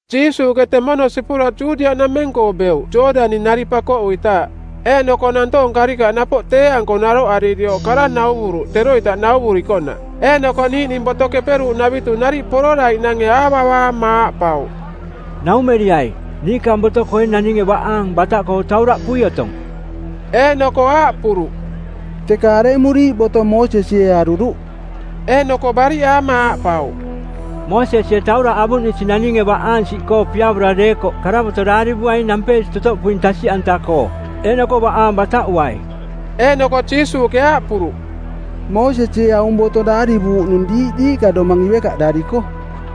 Jiisuuꞌke temono sipura Judiaꞌnameng-koo beuꞌ Jooꞌdani-nari pakoꞌuitaaꞌ. Eeꞌnoko nantoong karikaꞌ napoꞌ tee-anko naroꞌaririoꞌ kara nauvuruꞌ teroita nauvurikoꞌnaꞌ. Eeꞌnoko niiꞌning Boto Keperuuꞌnavitu nariꞌ pororaiꞌnange aavavaama aaꞌpauꞌ, “Naumeriai. Niikaang boto-koo ee naninge baꞌaang bataꞌkoo tauraꞌpui otong?” Eeꞌnoko aaꞌpuruꞌ, “Teka aremuriiꞌ boto Moosesie aruruꞌ?” Eeꞌnoko bariꞌaama aaꞌpauꞌ, “Moosesie tauraꞌ avuꞌnisi naninge baꞌaang siꞌkoo piavora deekoꞌ karavoto˜ daarivuaing nampeesi totoꞌpuing tasiꞌanta-koo, eeꞌnoko baꞌaang bataꞌuai.” Eeꞌnoko Jiisuuꞌke aaꞌpuruꞌ, “Moosesie aung boto daarivuuꞌnung diiꞌ diiꞌka domang ivekaꞌdariko.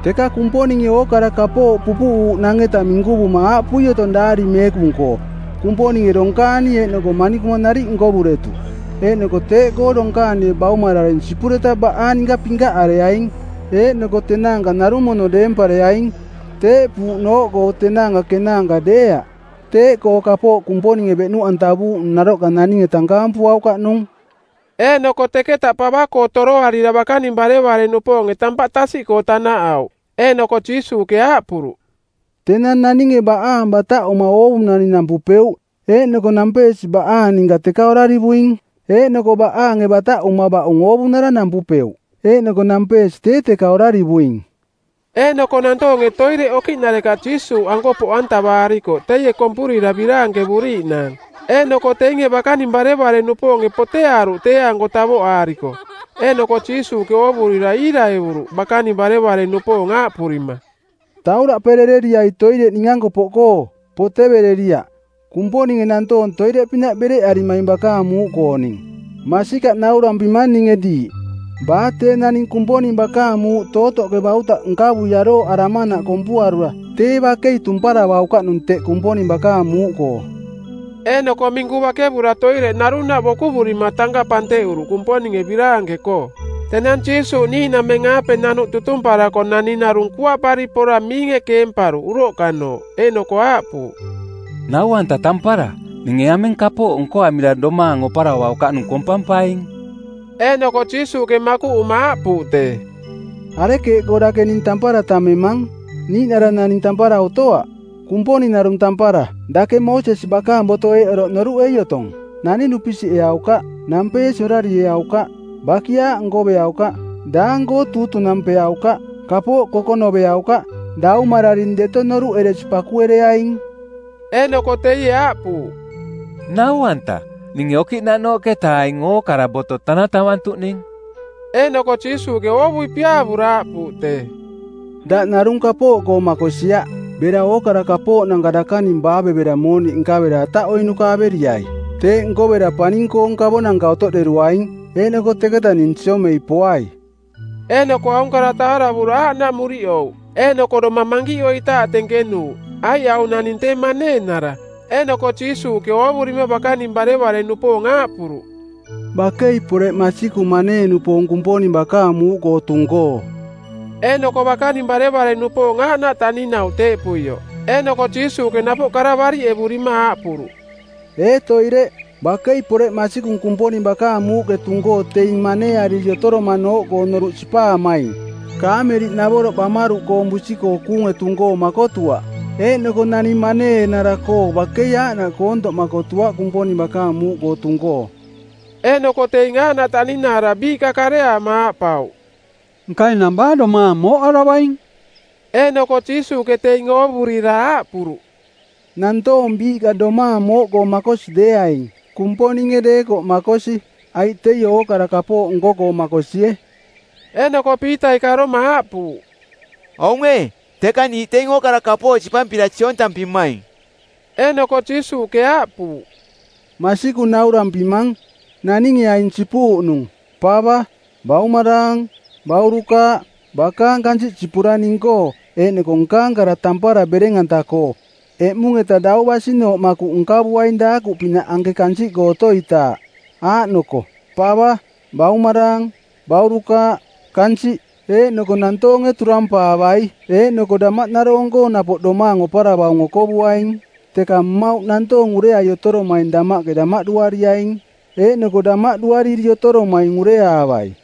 Teka Kumponinge ookara kapooꞌ pupuꞌuuꞌnang-eta minkuvuma aaꞌpui otong Daari Meekung-koo, ‘Kumponinge donkaani eeꞌnoko manikuma nariꞌ nkovuretuꞌ.’ Eeꞌnoko ‘Teeꞌkoo donkaanie baumararing sipureta baꞌaang ninka pinkaꞌareaing, eeꞌnoko tenaanka narung mono deempareaing.’ Teeꞌpuuꞌnooꞌkoo tenaanka kenaanka deeaꞌ. Teeꞌkoo kapooꞌ Kumponinge beꞌnuꞌantavuuꞌnung naroꞌka naninge tankaampuaukaꞌ nung.” Eeꞌnoko teketa pava-koo toroarira bakaning barevare-nupoonge tampaꞌ tasiꞌkoo tanaꞌauꞌ. Eeꞌnoko Jiisuuꞌke aaꞌpuruꞌ, “Tenang naninge baꞌaang bataꞌuma oovunani nampupeuꞌ eeꞌnoko nampeesi baꞌaang ninka teka orarivuing. Eeꞌnoko baꞌaange bataꞌuma baꞌung oovunara nampupeuꞌ eeꞌnoko nampeesi tee teka orarivuing.” Eeꞌnoko nantoonge toireꞌ okiꞌnarekaꞌ Jiisuuꞌanko poꞌantavaarikoꞌ teie kompurira biraankevuriiꞌnaang. Eeꞌnoko teinge bakaning barevare-nupoonge poteaaruꞌ tee-anko tavoꞌaariko. Eeꞌnoko Jiisuuꞌke oovurira iiraevuruꞌ bakaning barevare-nupoong aaꞌpurima, “Tauraꞌperereriai toireꞌ ning-anko poꞌkoo, potevereriaꞌ. Kumponinge nantoong toireꞌpinaꞌ bereꞌarimaing bakaang muuꞌkooning. Masikaꞌ naurampimang ninge diiꞌ, baa tee naning Kumponing bakaang muuꞌ tootoꞌke bautaꞌ nkavui arooꞌaramanaꞌ kompuarura tee bakei tumparavaukaꞌnung teꞌ Kumponing bakaang muuꞌkoo.” Eeꞌnoko minku bakevura toireꞌ narunaꞌ bokoꞌurima tankaꞌ panteꞌuruꞌ Kumponinge biraanke-koo. Tenang Jiisuuꞌ niiꞌnameng-aape nanuꞌ tutumparako naning narung kuaꞌpari pora miinge keemparuꞌ uroꞌkanooꞌ eeꞌnoko aaꞌpuuꞌ, “Nau-anta tampara, ninge aming kapooꞌ nkoamira domaang oparavaukaꞌnung kompampaing?” Eeꞌnoko Jiisuuꞌke makuꞌuma aaꞌpuuꞌ tee, “Arekeeꞌkoo dake ning tampara tammemang? Niiꞌnara naning tampara otoaꞌ, Kumponing narung tampara. Dake Moosesi bakaang boto eeꞌ oroꞌ noruꞌei otong: ‘Naning dupisiꞌeaukaꞌ. Nampeesi orarieaukaꞌ. bakiaaꞌ nkoveaukaꞌ. Daang-koo tuutunampeaukaꞌ. Kapooꞌ kokonoveaukaꞌ. Daumararing deto noruꞌeresi pakuereaing.’” Eeꞌnoko teie aaꞌpuuꞌ, “Nau-anta, ninge okiꞌnaꞌnooꞌketa aing ookara boto tanatavantuꞌning.” Eeꞌnoko Jiisuuꞌke oovui piaavura aaꞌpuuꞌ tee, “Daꞌ narung kapooꞌkoo makosiaꞌ. Bera ookara kapooꞌnanka dakaning baavevera mooniꞌ nkavera ataꞌoiꞌnuka averiai. Teeꞌ nkovera paning-koong kavonanka otoꞌderuaing. Eeꞌnoko teketa ning siomei poai.” Eeꞌnoko aung kara taaravura aaꞌnaꞌ muriꞌouꞌ, eeꞌnoko domang mankiꞌoitaaꞌ tenkenuuꞌ, aiꞌ aung naning tee maneenara. Eeꞌnoko Jiisuuꞌke ooꞌoovurima bakaning barevare-nupoong aaꞌpuruꞌ, “Bakei poreꞌ masikung manee-nupoong Kumponing bakaang muuꞌkoo tung-koo.” Eeꞌnoko bakaning barevare-nupoong aaꞌnaꞌ taꞌninauꞌ teeꞌpuioꞌ. Eeꞌnoko Jiisuuꞌke napoꞌ kara bariꞌevurima aaꞌpuruꞌ, “Ee toireꞌ, bakei poreꞌ masikung Kumponing bakaang muuꞌke tung-koo teing maneeariri otoromanooꞌkoo noruꞌ sipaamaing. Kaameliꞌnavoroꞌ bamaruꞌkoong busi-koo kuunge tung-koo makotuaꞌ, eeꞌnoko naning maneenara-koo bakei aaꞌnaꞌ koontoꞌ makotuaꞌ Kumponing bakaang muuꞌkoo tung-koo.” Eeꞌnoko teing aaꞌnaꞌ taꞌninaara biiꞌka kareaama aaꞌpauꞌ, “Nka enang baa domaang mooꞌaravaing?” Eeꞌnoko Jiisuuꞌke teing oovurira aaꞌpuruꞌ, “Nantoong biiꞌka domaang mooꞌkoo makosi deeaing, Kumponinge deekoꞌ makosi, aiꞌ teie ookara kapooꞌ nko-koo makosie.” Eeꞌnoko Piitai karoma aaꞌpuuꞌ, “Aung ee, teka niiꞌ teing ookara kapooꞌ sipampira siontampimaing.” Eeꞌnoko Jiisuuꞌke aaꞌpuuꞌ, “Masikung naurampimang, naninge aing sipuuꞌnung: pava, baumaraang, baurukaaꞌ, bakaang kansiꞌ sipura ning-koo eeꞌnoko nkaang kara tampara bereng-anta-koo, eꞌmung-eta dau basinooꞌ makuꞌ nkavuaing daakuꞌpinaꞌ anke kansiꞌkoo otoitaaꞌ; Aaꞌnoko: pava, baumaraang, baurukaaꞌ, kansiꞌ. Eeꞌnoko nantoonge turampaavai eeꞌnoko damaꞌnaroong-koo napoꞌ domaang oparavaung okovuaing. Teka mmauꞌ nantoong ureai otoromaing damaꞌke damaꞌduariaing, eeꞌnoko damaꞌduariri otoromaing ureaavai.”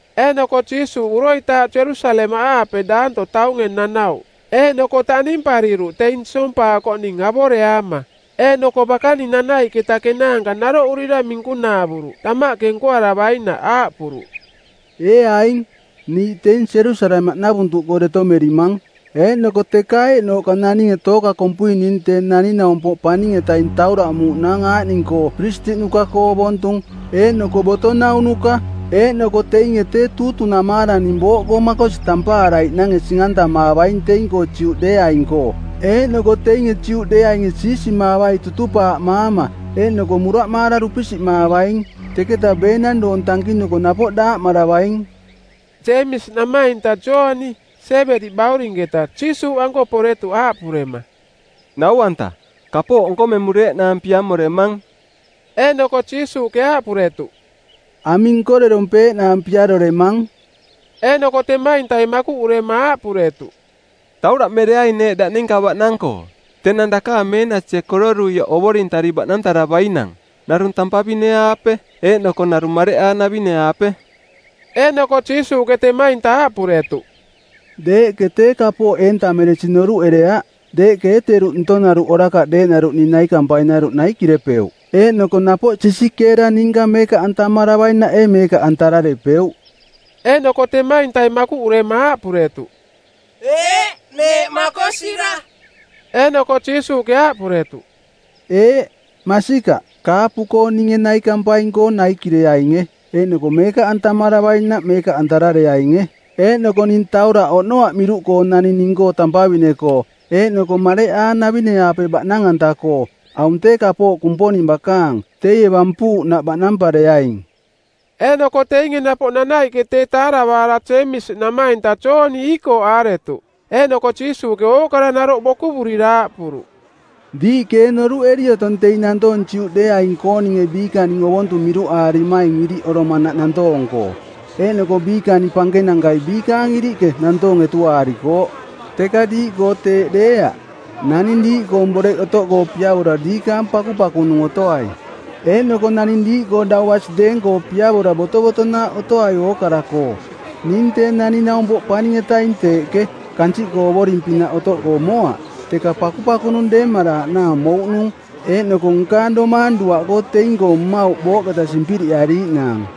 Eeꞌnoko Jiisuuꞌ uroitaaꞌ Jerusalemaꞌaape daanto taunge nanauꞌ, eeꞌnoko taꞌnimpariruꞌ teing siompaakoꞌning avoreaama. Eeꞌnoko bakaning nanaiꞌketa kenaanka naroꞌurira minkunaavuruꞌ damaꞌke nkoaravainaꞌ Aaꞌpuruꞌ, “Ee aing, niiꞌ teing Jerusalemaꞌnavuntuꞌkoo deto merimang. Eeꞌnoko teka eeꞌnooꞌka naninge tooka kompui ning Tee Naning-naumpoꞌ Paning-etaing tauraꞌmuuꞌnaang aaꞌning-koo Piristiꞌnuka-koo ovontung eeꞌnoko boto naunuka; eeꞌnoko teinge tee tuutunamaara ning booꞌkoo makosi tampaaraiꞌnange sing-antamaavaing teing-koo Juꞌdeeaing-koo. Eeꞌnoko teinge Juꞌdeeainge siisimaavai tutupaaꞌmaama, eeꞌnoko muraꞌmaara dupisiꞌmaavaing. Teketa beenang doong tankinuko napoꞌ daaꞌmaravaing.” Jeemisi namainta Jooni, Siebedi baurinketa, Jiisuuꞌanko poretuꞌ aaꞌpurema, “Nau-anta, kapooꞌ nkomemureeꞌnaang piamoremang.” Eeꞌnoko Jiisuuꞌke aaꞌpuretuꞌ, “Aming nkorerompeeꞌnaang piaroremang?” Eeꞌnoko temaintai makuꞌurema aaꞌpuretuꞌ, “Tauraꞌmereaing neeꞌ daꞌ ninka baꞌnang-koo, tenang dakaang meenasie kororuioꞌ ovorintari baꞌnantaravainang, narung tampavine-aape eeꞌnoko narung mareꞌaanavine-aape.” Eeꞌnoko Jiisuuꞌke temainta aaꞌpuretuꞌ, “Deeꞌke tee kapooꞌ eentameresing noruꞌereaꞌ. Deeꞌke ee teruꞌ ntonaruꞌ orakaꞌ deeꞌnaruꞌ ning naikampainaruꞌ naikirepeuꞌ? Eeꞌnoko napoꞌ sisikeera ninka meekaꞌantamaravainaꞌ ee meekaꞌantararepeuꞌ?” Eeꞌnoko temaintai makuꞌurema aaꞌpuretuꞌ, “Eeꞌ, neeꞌ makosira.” Eeꞌnoko Jiisuuꞌke aaꞌpuretuꞌ, “Eeꞌ, masikaꞌ, kaapu-koo ninge naikampaing-koo naikireainge, eeꞌnoko meekaꞌantamaravainaꞌ meekaꞌantarareainge. Eeꞌnoko ning tauraꞌ oꞌnoaꞌ miruꞌkoo naning ning-koo tampavine-koo eeꞌnoko mareꞌaanavine-aape baꞌnang-anta-koo. Aung tee kapooꞌ Kumponing bakaang. Teie bampuuꞌnaꞌ baꞌnampareaing.” Eeꞌnoko teinge napoꞌ nanaiꞌke teeꞌ taaravaara Jeemisi namainta Jooni iikooꞌaaretuꞌ. Eeꞌnoko Jiisuuꞌke ookara naroꞌ bokuvurira aaꞌpuruꞌ, “Diiꞌke ee noruꞌeri otong teing nantoong Juꞌdeeaing-kooninge biikaning ovontung miruꞌaarimaing iriꞌoromanaꞌ nantoong-koo. Eeꞌnoko biikaning pankenankai biikaang iriꞌke nantoong etuaarikooꞌ. Teka diiꞌkoo teeꞌ deeaꞌ. Naning diiꞌkoong boreꞌ otoꞌkoo piavora diikaang pakupakunung otoai. Eeꞌnoko naning diiꞌkoo dau basi deeng-koo piavora botovotonaaꞌ otoai ookara-koo. Ning Tee Naning-naumpoꞌ Paning-etaing teeꞌke, kansiꞌkoo ovoring-pinaꞌ otoꞌkoo moaꞌ, teka pakupakunung deemaraaꞌnaang mouꞌnung, eeꞌnoko nkaang domaang duaꞌkoo teing-koo mmauꞌ booꞌketa simpiriꞌariiꞌnaang.”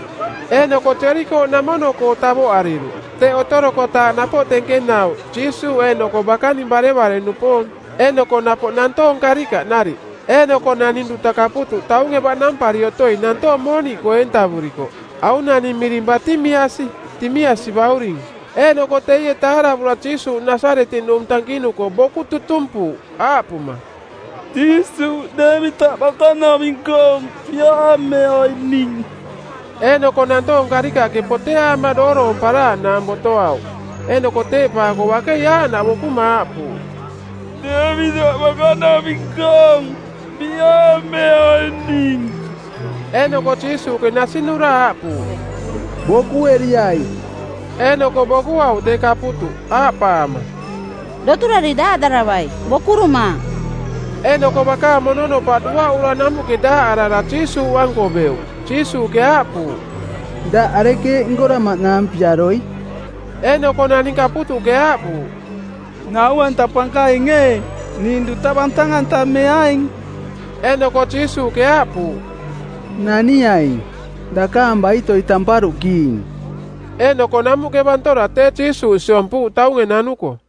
Eeꞌnoko Jerikooꞌnamono-koo tavoꞌariruꞌ. Teꞌ otorokotaaꞌ napoꞌ tenkenauꞌ Jiisuuꞌ eeꞌnoko bakaning barevare-nupoong. Eeꞌnoko napoꞌ nantoong karikaꞌ nariꞌ. Eeꞌnoko naning duta kaputuꞌ taunge baꞌnampari otoi nantoong mooniꞌkoo eentavurikoꞌ. Aung naning miring Batimiasi, Timiasi bauring. Eeꞌnoko teie taaravura Jiisuuꞌ Nasaretiꞌnung tankinuko boku tutumpuuꞌ aaꞌpuma, “Jiisuuꞌ, Deevitaꞌ bakanaving-koong, piaameai ning.” Eeꞌnoko nantoong karikaꞌke poteaama dooroomparaaꞌnaang botoauꞌ. Eeꞌnoko teeꞌpaako bakei aaꞌnaꞌ bokuma aaꞌpuuꞌ, “Deevitaꞌ bakanaving-koong, piaameai ning.” Eeꞌnoko Jiisuuꞌke nasinura aaꞌpuuꞌ, “Bokueriai.” Eeꞌnoko bokuauꞌ tee kaputuꞌ, aaꞌpaama, “Doturari daaꞌdaravai. Bokurumaang.” Eeꞌnoko bakaang mononopaꞌ duaꞌura namuꞌke daaꞌarara Jiisuuꞌanko beuꞌ. Jiisuuꞌke aaꞌpuuꞌ, “Daꞌ arekeeꞌ nkoramaꞌnaang piaroi?” Eeꞌnoko naning kaputuꞌke aaꞌpuuꞌ, “Nau-anta Pankaing ee, ning duta bantang-antameaing.” Eeꞌnoko Jiisuuꞌke aaꞌpuuꞌ, “Naniaing. Dakaang baitoi tamparuꞌkiing.” Eeꞌnoko namuꞌke bantora tee Jiisuuꞌ siompuuꞌ taunge nanuko.